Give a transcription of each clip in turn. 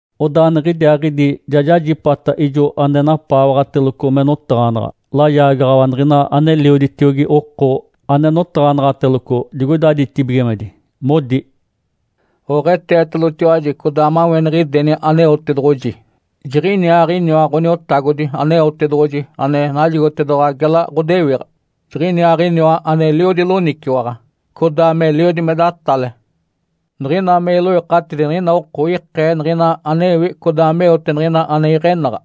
Odaa niɡ̶idiaaɡ̶idi ja jajipata ijo ane napaawaɡ̶ateloco me notaɡ̶anaɡ̶a, layaagaɡ̶awa niɡ̶ina anelioditiogi oko ane notaɡ̶anaɡ̶ateloco digoida ditibigimedi modi, “Oɡ̶eetetalotiwaji codaa maweniɡ̶ideni Aneotedoɡ̶oji! Jiɡ̶iniaaɡ̶iniwa Ǥoniotagodi Aneotedoɡ̶oji ane najigotedoɡ̶owa gela ɡ̶odewiɡ̶a. Jiɡ̶iniaaɡ̶iniwa aneliodi loniciwaɡ̶a, codaa meliodi me datale. Niɡ̶ina me iloikatidi niɡ̶ina oko ikee niɡ̶ina anewi codaa meote niɡ̶ina ane iɡ̶enaɡ̶a.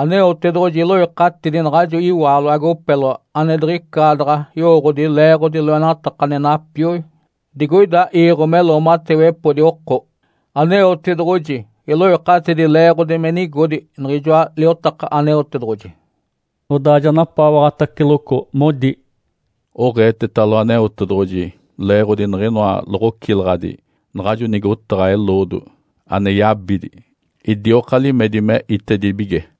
Aneotedoɡ̶oji iloikatidi naɡ̶ajo iwaalo agopeloa ane diɡ̶icaadaɡ̶a yowooɡ̶odi leeɡ̶odi loenataka ane napioi digoida iiɡ̶o me loomatewepodi oko. Aneotedoɡ̶oji iloikatidi leeɡ̶odi me nigodi niɡ̶ijoa liotaka Aneotedoɡ̶oji.” Odaa ja napaawaɡ̶ataceloco modi, “Oɡ̶eetetalo Aneotedoɡ̶oji leeɡ̶odi niɡ̶inoa loɡ̶ocilaɡ̶adi naɡ̶ajo nigotaɡ̶a eloodo ane yabidi idioka limedi me itedibige!”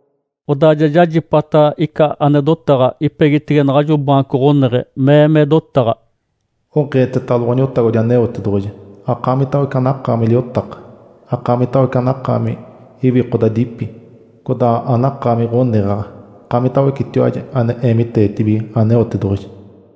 Odaa ja jajipata ica ane dotaɡ̶a ipegitege naɡ̶ajo baanco ɡ̶oneɡ̶e mee me dotaɡ̶a, “Oɡ̶eetetalo Ǥoniotagodi Aneotedoɡ̶oji, akaamitawece anakaami liotaka, akaamitawece anakaami iwikodadipi, codaa anakaami ɡ̶oneɡ̶aɡ̶a, akaamitawecetiwaji ane eemiteetibige Aneotedoɡ̶oji!”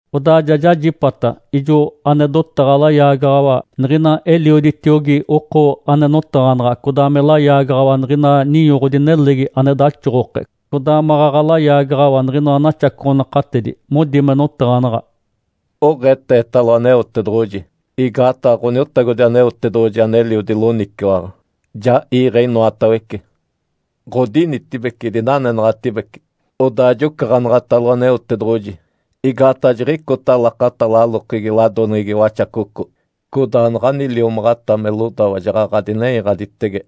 Odaa ja jajipata ijo ane dotaɡ̶a layaagaɡ̶awa niɡ̶ina elioditiogi oko ane notaɡ̶anaɡ̶a, codaa me layaagaɡ̶awa niɡ̶ina ninyoɡ̶odi nelegi ane daxoɡ̶oke codaa maɡ̶aɡ̶a layagaɡ̶awa niɡ̶inoa naxacoɡ̶onakatedi. Modi me notaɡ̶anaɡ̶a, “Oɡ̶eetetalo Aneotedoɡ̶oji, igaataɡ̶a Ǥoniotagodi Aneotedoɡ̶oji aneliodi loniciwaɡ̶a, ja iiɡ̶e inoatawece. Ǥodinitibece, idinanenaɡ̶atibece. Odaa jocaɡ̶anaɡ̶atalo Aneotedoɡ̶oji. Igaataɡ̶a jiɡ̶icota lakata lalokegi ladoneɡ̶egi Waxacoco, codaa naɡ̶ani liomaɡ̶ata me lodawa jaɡ̶aɡ̶a dinenyaɡ̶aditege.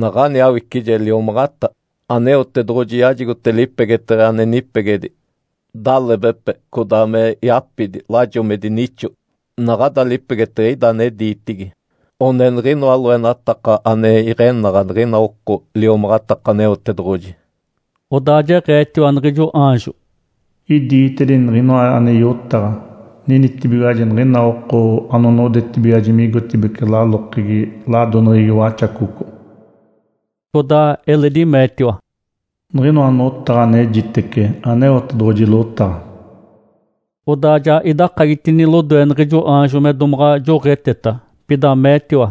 Naɡ̶ani awicije liomaɡ̶ata, Aneotedoɡ̶oji yajigote lipegeteɡ̶e ane nipegedi, dalebepe, codaa me yapidi, lajo me dinixo. Naɡ̶ada lipegeteɡ̶e ida ane diitigi, one niɡ̶inoa loenataka ane iɡ̶enaɡ̶a niɡ̶ina oko liomaɡ̶ataka Aneotedoɡ̶oji.” Odaa jeɡ̶eetiwa niɡ̶ijo aanjo, “Idiitedini niɡ̶inoa ane yotaɡ̶a: Ninitibigiwaji niɡ̶ina oko anonodetibigiwaji migotibeci lalokegi ladoneɡ̶egi Waxacoco.” Codaa eledi meetiwa, “Niɡ̶inoa notaɡ̶a anejitece, Aneotedoɡ̶oji lotaɡ̶a.” Odaa ja idakagitini lodoe niɡ̶ijo aanjo me domaɡ̶a joɡ̶eteta, pida meetiwa,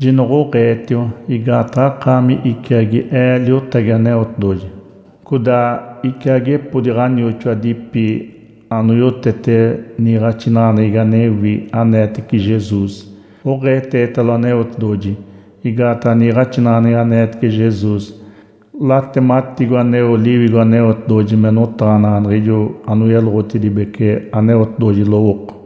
“Jinoɡ̶oɡ̶eetiwa! Igaataɡ̶a akaami iciagi ee liotagi Aneotedoɡ̶oji, codaa iciagepodi ɡ̶anioxoadipi anoyotete niiɡ̶axinaɡ̶aneɡ̶egi anewi aneetece Jesus. Oɡ̶eetetalo Aneotedoɡ̶oji! Igaataɡ̶a niiɡ̶axinaɡ̶aneɡ̶egi aneetece Jesus, latematigo aneo Liwigo Aneotedoɡ̶oji me notaɡ̶anaɡ̶a niɡ̶ijo anoyeloɡ̶oditedibece Aneotedoɡ̶oji lowooko.”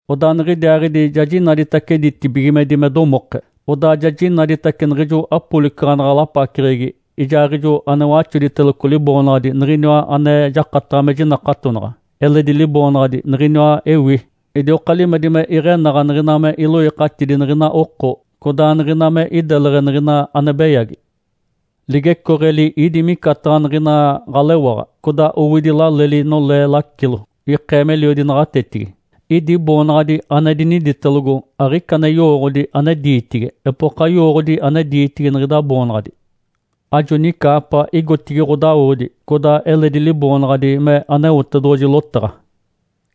Odaa niɡ̶idiaaɡ̶idi ja jinaditace ditibigimedi me domoke. Odaa ja jinaditace niɡ̶ijo apolicaɡ̶anaɡ̶a lapaceɡ̶egi ijaaɡ̶ijo ane waxoditeloco liboonaɡ̶adi, “Niɡ̶iniwa ane jakataɡ̶a me jinakatonaɡ̶a”, eledi liboonaɡ̶adi “Niɡ̶iniwa ewi”. Idioka limedi me iɡ̶enaɡ̶a niɡ̶ina me iloikatidi niɡ̶ina oko, codaa niɡ̶ina me ideleɡ̶e niɡ̶ina ane beyagi. Ligecooɡ̶eli ídi micataɡ̶a niɡ̶ina ɡ̶alewaɡ̶a. Codaa owidi laleli nolee lacilo (ikee meliodi naɡ̶atetigi). Idi boonaɡ̶adi ane diniditelogo, aɡ̶ica ane yowooɡ̶odi ane diitigi. Epoka yowooɡ̶odi ane diitigi niɡ̶ida boonaɡ̶adi. Ajo nicaapa igotigi ɡ̶odawodi. Codaa eledi liboonaɡ̶adi me “Aneotedoɡ̶oji Lotaɡ̶a.”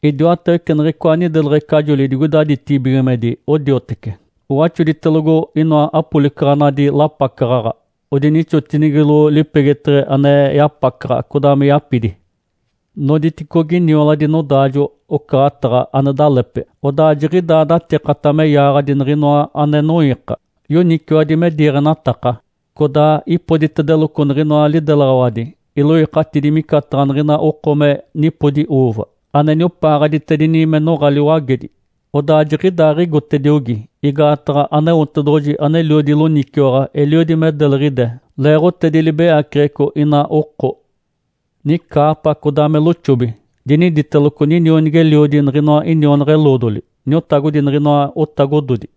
Idiwatawece niɡ̶icoa nideleɡ̶ecajoli digoida ditibigimedi odiotece, owaxoditelogo inoa apolicaɡ̶anadi lapacaɡ̶aɡ̶a, odinixotinigilo lipegeteɡ̶e ane yapacaɡ̶a, codaa me yapidi. Noditicogi nioladi nodaajo-ocaɡ̶ataɡ̶a ane dalepe, odaa jiɡ̶idaa datikata me yaaɡ̶adi niɡ̶inoa ane noiika, yoniciwadi me diiɡ̶enataka. Codaa ipoditedeloco niɡ̶inoa lidelaɡ̶awadi iloikatidi micataɡ̶a niɡ̶ina oko me nipodi “uuva”, ane niopaaɡ̶aditedini me noɡ̶a liwagedi. Odaa jiɡ̶idaaɡ̶igotediogi, igaataɡ̶a Aneotedoɡ̶oji, aneliodi loniciwaɡ̶a, eliodi me deliɡ̶ide leeɡ̶otedi libeyaceɡ̶eco ina oko. Nicaapa codaa me loxobi diniditeloco, “Ninionigi-eliodi niɡ̶inoa inionaɡ̶a-eloodoli, Niotagodi niɡ̶inoa otagododi.”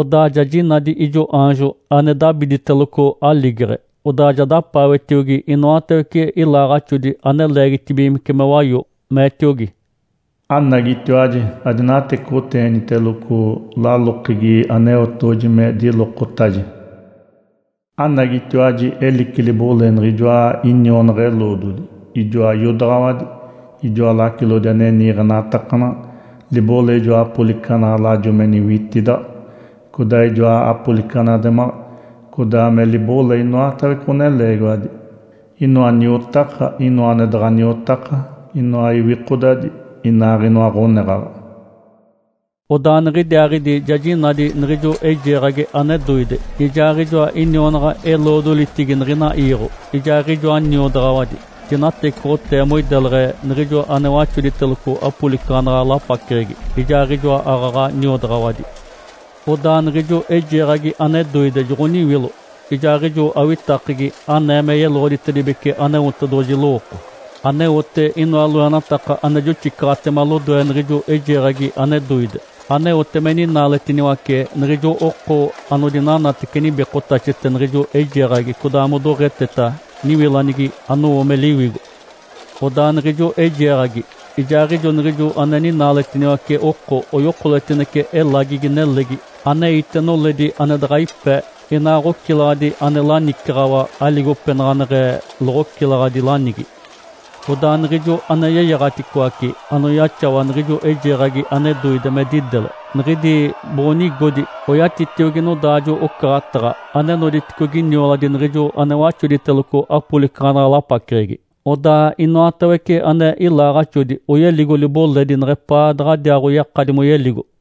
Odaa ja jinadi ijo aanjo ane dabiditeloco aligeɡ̶e. Odaa ja dapaawetiogi inoatawece ilaaɡ̶axodi ane leegitibigimece me wayo, meetiogi, “Anagitiwaji, adinatecoɡ̶oteeniteloco lalokegi Aneotedoɡ̶oji me dilokotaje. Anagitiwaji elici libole niɡ̶ijoa inionaɡ̶a-eloodoli, ijoa iodaɡ̶awadi, ijoa lacilodi ane niiɡ̶enatakanaɡ̶a, libole ijoa apolicaɡ̶anadi lajo me niwitidaɡ̶a, codaa ijoa apolicaɡ̶anaɡ̶ademaɡ̶a, codaa me libole inoatawece ɡ̶oneleegiwadi, inoa niotaka, inoa ane daɡ̶a niotaka, inoa iwikodadi, inaaɡ̶inoa ɡ̶oneɡ̶aɡ̶a!” Odaa niɡ̶idiaaɡ̶idi ja jinadi niɡ̶ijo eijeeɡ̶agi ane doide, ijaaɡ̶ijoa inionaɡ̶a-eloodolitigi niɡ̶ina iiɡ̶o, ijaaɡ̶ijoa niodaɡ̶awadi, dinatecoɡ̶otee moideleɡ̶e niɡ̶ijo ane waxoditeloco apolicaɡ̶anaɡ̶a lapaceɡ̶egi, ijaaɡ̶ijoa aaɡ̶aɡ̶a niodaɡ̶awadi. Odaa niɡ̶ijo eijeeɡ̶agi ane doide joɡ̶oniwilo, ijaaɡ̶ijo awitakegi anee me yeloɡ̶oditedibece Aneotedoɡ̶oji lowooko, aneote inoa loenataka ane joxicaɡ̶atema lodoe niɡ̶ijo eijeeɡ̶agi ane doide, aneote me ninaaletiniwace niɡ̶ijo oko anodinanatece nibikotaxete niɡ̶ijo eijeeɡ̶agi codaa modoɡ̶eteta niwilanigi anowo me liwigo. Odaa niɡ̶ijo eijeeɡ̶agi ijaaɡ̶ijo niɡ̶ijo ane ninaaletiniwace oko oyokoletinece elagigi nelegi aneite noledi ane daɡ̶a ipe, inaa ɡ̶ocilaɡ̶adi ane lanicaɡ̶awa aligopenaɡ̶aneɡ̶e loɡ̶ocilaɡ̶adi lanigi. Odaa niɡ̶ijo ane yeyaɡ̶aticoace anoyaxawa niɡ̶ijo eijeeɡ̶agi ane doide me didele, niɡ̶idi boɡ̶onigodi oyatitiogi nodaajo-ocaɡ̶ataɡ̶a ane noditicogi nioladi niɡ̶ijo ane waxoditeloco apolicaɡ̶anaɡ̶a lapaceɡ̶egi. Odaa inoatawece ane ilaaɡ̶axodi oyeligo liboledi neɡ̶epaa daɡ̶adiaaɡ̶oyakadi moyeligo.